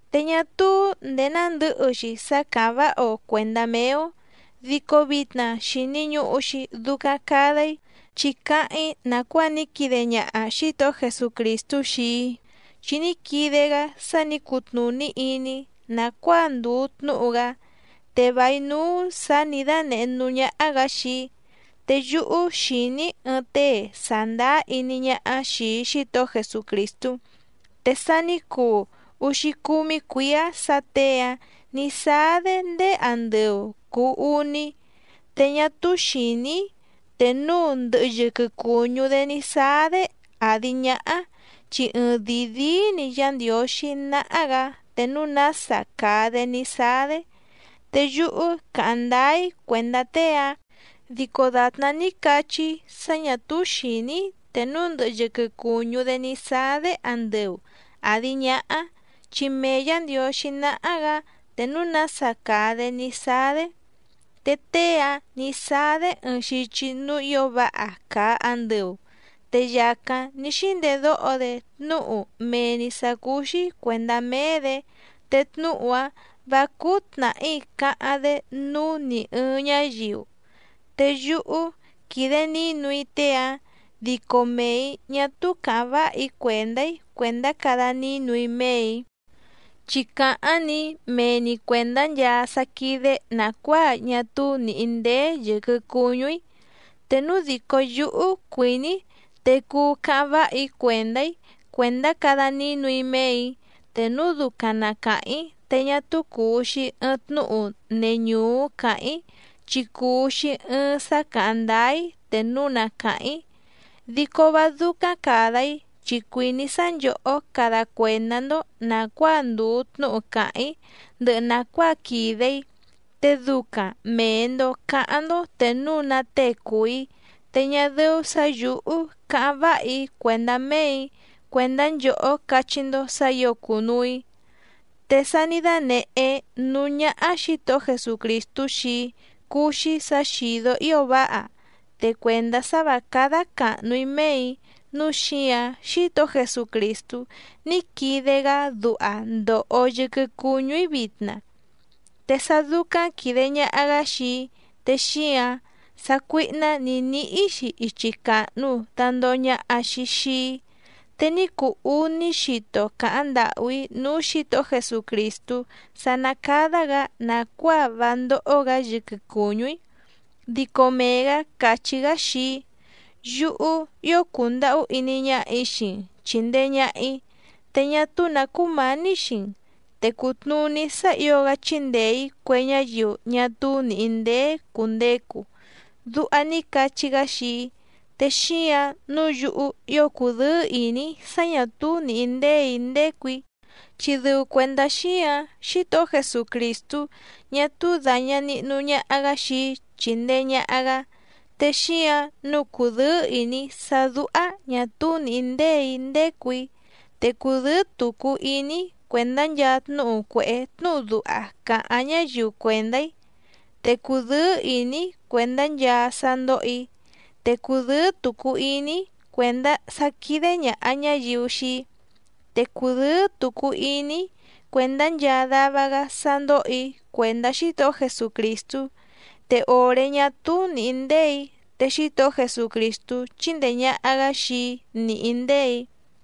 Te ñá túú ndèé nándɨ̌hɨ‑xi sá càháⁿ váha‑o cuèndá méé‑ó, dico vitna xìni ñuhu‑xi ducaⁿ cada‑í chi cáháⁿ‑í nàcuáa ní quide ñaha Xǐtohó Jesucrìstú xii‑í, chi ní quide‑gá sá nǐ cutnùní iní‑í nàcuáa ndùu tnúhu‑gá, te vài núú sǎ nǐ dánèhé núú ñáhá‑gǎ xii‑í. Te yúhú xìní‑í ɨɨⁿ tée sàndáá iní ñáhá xìi Xítohó Jesucrìstú, te sa ní cuu úxícúmí cuǐá sǎ těe‑áⁿ nǐ sáá‑dé ndéé andɨu cùu uní, te ñá túú xìní‑í te núu ndɨhɨ yɨquɨ cùñú‑dé ní sáá‑dé àdi ñáhá, chi ɨɨⁿdìi díí‑ni Yá Ndiǒxí náhá‑gǎ te núu nása càa‑dé ní sáá‑dé. Te yúhú càháⁿ ndáá‑í cuèndá tée‑áⁿ, dico dàtná ní cachí‑í sá ñà túú xìní‑í te núu ndɨhɨ yɨquɨ cùñú‑dé ní sáá‑dé andɨu àdi ñáhá, chi mee Yǎ Ndiǒxí náhá‑gǎ te núu nása càa‑dé ní sáá‑dé. Te tée‑áⁿ nǐ sáá‑dé ɨɨⁿ xichi núú ǐo váha càa andɨu, te yàcáⁿ ní xíndedóho‑dé tnúhu mee‑ni sǎ cúú‑xí cuèndá méé‑dě, te tnúhu‑áⁿ vǎ cúú tnàhí cáháⁿ‑dé núú nì ɨɨⁿ ñáyiu. Te yúhú quídé nǐnu‑í tée‑áⁿ, dico mee‑ǐ ñá túú càháⁿ váha‑í cuèndá‑í cuèndá cada nínu‑í méè‑í, chi càháⁿ‑ni mee‑ni cuèndá nchaa sá quídé nàcuáa ñá túú nìhí ndéé yɨ̀quɨ cuñú‑í. Te núu dìcó yúhú cuìní‑í te cuu cáháⁿ váha‑í cuèndá‑í cuèndá cada nínu‑í méè‑í, te núu ducaⁿ na càháⁿ‑í te ñá túú cùu‑xi ɨɨⁿ tnúhu neñùú cáháⁿ‑í, chi cùu‑xi ɨɨⁿ sá càháⁿ ndáá‑í te núu na càháⁿ‑í. Dico vá dúcáⁿ càda‑í chi cuìní‑í sá nchòhó cada cuèndá‑ndó nàcuáa ndùu tnúhu càháⁿ‑í ndɨhɨ nàcuáa quìde‑í, te ducaⁿ mèe‑ndo cáháⁿ‑ndó te núu ná tée cùu‑í, te ñá dɨ́ú sǎ yǔhú cáháⁿ váha‑í cuèndá méè‑í cuèndá nchòhó cachí‑ndó sǎ ǐo cùnuu‑í. Te sá nǐ dánèhé núú ñáhá Xǐtohó Jesucrìstú xii‑í cúú‑xí sǎ xìdó ío váha, te cuèndá sá vǎ cádá càhnu‑í méè‑í nǔu xíǎⁿ Xítohó Jesucrìstú ní quide‑gá duha ndòho yɨquɨ cuñú‑í vitna. Te sá dúcáⁿ quìde ñaha‑gá xii‑í te xíǎⁿ sácuíhná nǐ níhí‑xi ichi càhnu dandoho ñaha‑xi xii‑í. Te ní cuu úní xito càháⁿ ndàhú‑í núú Xǐtohó Jesucrìstú sá ná cádá‑gǎ nàcuáa vá ndóhó‑gǎ yɨquɨ cùñú‑í. Dico mee‑gǎ càchí‑gá xii‑í: “Yúhú ío cùndahú iní ñáhà‑í xii‑n chìndee ñaha‑í, te ñá túú nǎ cúmǎní xii‑n, te cùtnuní sá ǐo‑gá chíndèe‑í cue ñáyiu ñá túú nìhí ndéé cùndecu”, duha ní cachí‑gá xii‑í. Te xíǎⁿ nǔu yúhú ío cùdɨ́ɨ́ ìní‑í sá ñà túú nìhí ndéè‑í ndécù‑í, chi dɨu cuèndá xíǎⁿ Xítohó Jesucrìstú ñá túú dàña nihnu ñaha‑gá xii‑í chíndèe ñaha‑gá. Te xíǎⁿ nǔu cùdɨ́ɨ́ ìní‑í sá dúhá ñǎ túu nìhí ndéè‑í ndécù‑í, te cùdɨ́ɨ́ tucu iní‑í cuèndá nchaa tnúhu cuèhé tnúhu duha càháⁿ ñáyiu cuèndá‑í, te cùdɨ́ɨ́ ìní‑í cuèndá nchaa sá ndóhò‑í, te cùdɨ́ɨ́ tucu iní‑í cuèndá sá quídé ñàha ñáyiu xii‑í, te cùdɨ́ɨ́ tucu iní‑í cuèndá nchaa dava‑gá sá ndóhò‑í cuèndá Xítohó Jesucrìstú. Te òré ñá túú nìhí ndéè‑í te Xítohó Jesucrìstú chíndèe ñaha‑gá xii‑í nìhí ndéè‑í.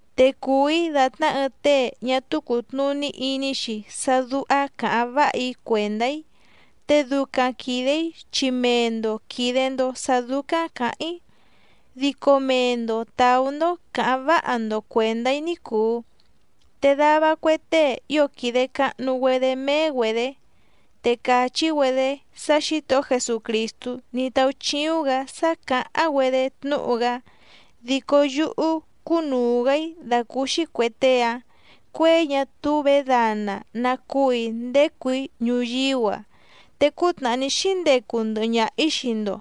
Te cùu‑í dàtná ɨɨⁿ tée ñá túú cùtnuní iní‑xi sá dúhá càháⁿ váha‑í cuèndá‑í, te ducaⁿ quìde‑í chi mee‑ndo quìde‑ndo sá dúcáⁿ cǎháⁿ‑í, dico mee‑ndo tàú‑ndó cǎháⁿ váha‑ndo cuèndá‑í ní cùu. Te dava cue tée ío quìde cahnu‑güedé méé‑güedě, te càchí‑güedé sá Xǐtohó Jesucrìstú ní táúchíúⁿ‑gǎ sá càháⁿ‑güedé tnúhu‑gá, dico yúhú cúnùu‑gá‑í dàcúúxí cuè tée‑áⁿ cuěi ñá túú vědana ná cúù‑í ndécù‑í ñuyíú‑a. Te cútnàhá ní xíndecu ndɨhɨ ñaha‑ǐ xii‑ndo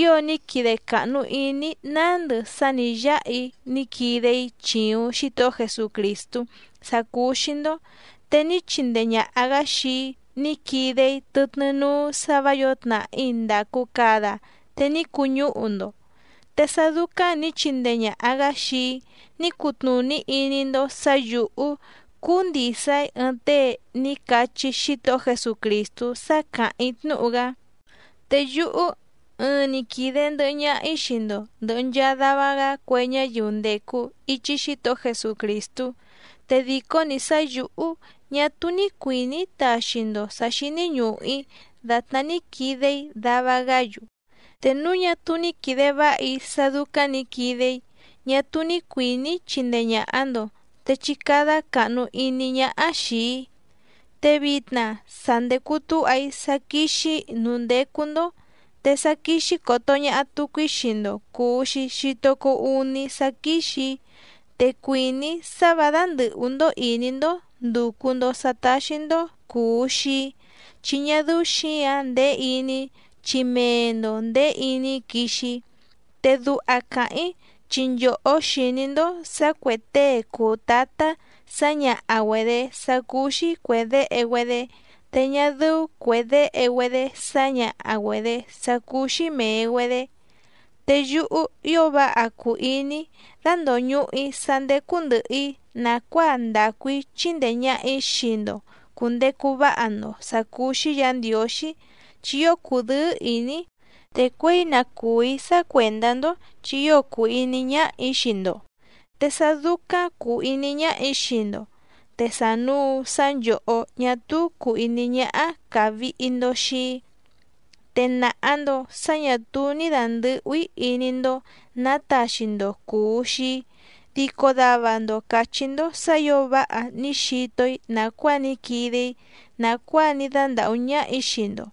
ǐo ní quide càhnu iní‑í nándɨ sá nǐ yáha‑í ní quide‑í chìuⁿ Xítohó Jesucrìstú sá cúú‑xí‑ndó. Te ní chindee ñàha‑gá xii‑í ní quide‑í tɨtnɨ́ núú sǎ vǎ yǒo tnàhí ndàcu cada te ní cuñúhu‑ndo, te sá dúcáⁿ nǐ chindee ñàha‑gá xii‑í ní cutnùní iní‑ndó sǎ yǔhú cúú ndìsa‑í ɨɨⁿ tée ní cachí Xítohó Jesucrìstú sá càháⁿ‑í tnúhu‑gá. Te yúhú ɨɨⁿ‑ni quìde ndɨhɨ ñaha‑í xii‑ndo ndɨ̀hɨ nchaa dava‑gá cue ñáyiu ndècu ichi Xítohó Jesucrìstú, te dìcó‑ni sá yǔhú ñá túú ní cuìní‑í taxi‑ndo sǎ xíní ñùhu‑í dàtná ní quide‑í dava‑gá‑yu. Te núu ñá túú ní quìde váha‑í sá dúcáⁿ nǐ quide‑í ñá túú ní cuìní‑í chindee ñàha‑ndo te chí cádá càhnu iní ñáhá xìi‑í. Te vitna sa ndècu túha‑í sá quíxì‑í núú ndécú‑ndó, te sá quíxí còto ñaha tucu‑í xii‑ndo cùu‑xi xito cuu úní sá quíxì‑í, te cuìní‑í sá vǎ dándɨ̀hú‑ndó ìní‑ndó ndùcu‑ndo sá táxí‑ndó cùu xii‑í, chi ñá dɨ́ú xǐǎⁿ ndèé iní‑í chi mee‑ndo ndèé iní‑í quixi‑í. Te duha càháⁿ‑í chi nchòhó xìní‑ndó sǎ cuè tée cùu tátá sǎñaha‑güedě sá cúú‑xí cuè déhe‑güedé te ñá dɨ́ú cuè déhe‑güedé sǎñaha‑güedě sá cúú‑xí mèe‑güedé. Te yúhú ío váha cùu iní‑í dandòñuhu‑í sá ndécú ndɨ̀hɨ‑í nàcuáa ndacu‑í chindee ñàha‑í xii‑ndo cùndecu váha‑ndo sǎ cúú‑xí Yǎ Ndiǒxí chi ío cùdɨ́ɨ́ ìní‑í, te cuěi na cùu‑í sá cuèndá‑ndó, chi ío cùu iní ñáhà‑í xii‑ndo, te sá dúcáⁿ cùu iní ñáhà‑í xii‑ndo, te sànuu sá nchòhó ñá túú cùu iní ñáhá càvihi‑ndo xii‑í. Te nàha‑ndo sá ñà túú ní dàndɨhú‑í iní‑ndó nǎ taxi‑ndo cùu xii‑í, dico dava‑ndo càchí‑ndó sǎ ǐo váha ní xito‑í nàcuáa ní quide‑í nàcuáa ní dándàhú ñáhà‑í xii‑ndo.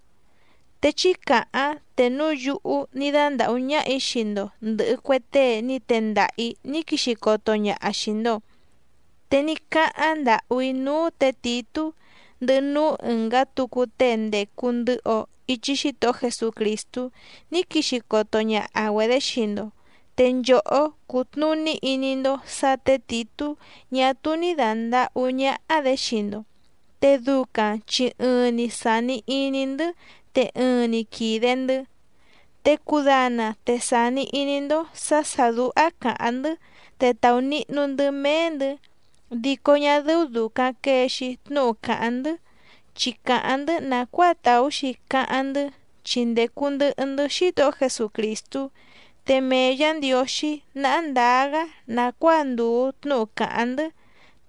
Te chí càháⁿ te núu yúhú ní dándàhú ñáhà‑í xii‑ndo ndɨ̀hɨ cue tée ní tendaha‑ǐ ní quixi coto ñaha xìi‑ndo. Te ní cáháⁿ ndàhú‑í núú tě Tìtú ndɨhɨ núú ɨ̀ngá tucu tée ndècu ndɨhɨ‑o ichi Xítohó Jesucrìstú ní quixi coto ñaha‑güedě xii‑ndo. Te nchòhó cútnùní iní‑ndó sǎ tě Tìtú ñá túú ní dàndahú ñáhá‑dě xii‑ndo, te ducaⁿ chi ɨɨⁿ‑ni sàni iní‑ndɨ́ te ɨɨⁿ‑ni quìde‑ndɨ́. Te cudana te sàni iní‑ndó sǎ sà dúhá càháⁿ‑ndɨ́ te tàunihnu‑ndɨ́ méé‑ndɨ̌, dico ñá dɨ́ú dùcaⁿ quee‑xi tnúhu càháⁿ‑ndɨ́, chi càháⁿ‑ndɨ́ nàcuáa tàú‑xi cáháⁿ‑ndɨ́ chi ndècu ndɨhɨ‑ndɨ́ Xítohó Jesucrìstú, te mee Yǎ Ndiǒxí náhá ndǎá‑gá nàcuáa ndùu tnúhu càháⁿ‑ndɨ́,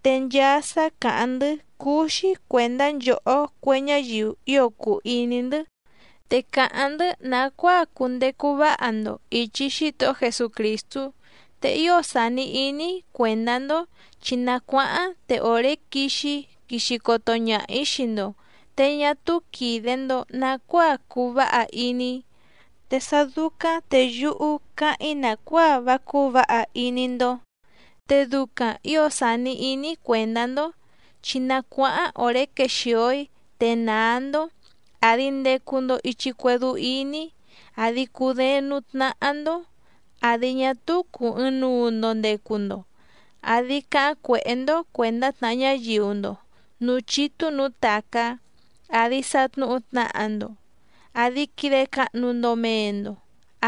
te nchaa sá càháⁿ‑ndɨ́ cúú‑xí cuèndá nchòhó cue ñáyiu ío cùu iní‑ndɨ́, te càháⁿ‑ndɨ́ nàcuáa cundecu váha‑ndo ìchi Xítohó Jesucrìstú. Te ío sàni iní‑í cuèndá‑ndó chi na cuáháⁿ te òré quixi‑í quixi coto ñaha‑ǐ xii‑ndo, te ñá túú quìde‑ndo nacuáa cuu váha iní‑í, te sá dúcáⁿ te yúhú cáháⁿ‑í nàcuáa vá cúú vǎha iní‑ndó, te ducaⁿ ǐo sàni iní‑í cuèndá‑ndó chi na cuáháⁿ òré quexìo‑í te nàá‑ndó, àdi ndecu‑ndo ichi cuédú íní, àdi cudééⁿ nǔú tnáhá‑ndó, àdi ñá túú cùu ɨɨⁿnuu‑ndo ndecu‑ndo, àdi cáháⁿ cuèhé‑ndó cuèndá tnàha ñáyiu‑ndo nǔú chítú nǔú tàcá, àdi satnuhu tnaha‑ndo, àdi quide cahnu‑ndo mee‑ndo,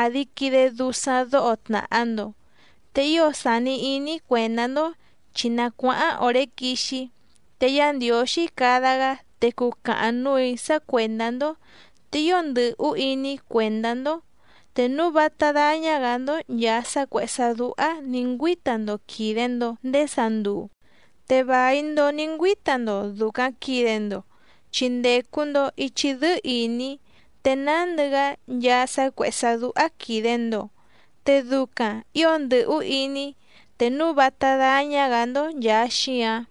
àdi quide dusaⁿ dóho tnàha‑ndo. Te ío sàni iní‑í cuèndá‑ndó chi na cuáháⁿ òré quixi‑í, te Yá Ndiǒxí cada‑gá te cucahaⁿ núù‑í sá cuèndá‑ndó, te ío ndɨ́hú iní‑í cuèndá‑ndó te núu vátá dáñá‑gǎ‑ndó nchàa sá cuèhé sá dúhá nǐ ngüíta‑ndo quìde‑ndo ndéé sanduu, te vài‑ndo ní ngüíta‑ndo dùcaⁿ quide‑ndo, chi ndècu‑ndo ichi dɨ́ɨ́ ìní te nándɨ‑gá nchaa sá cuèhé sá dúhá quìde‑ndo, te ducaⁿ ǐo ndɨ̀hú iní‑í te núu vátá dáñá‑gǎ‑ndó nchàa xíǎⁿ.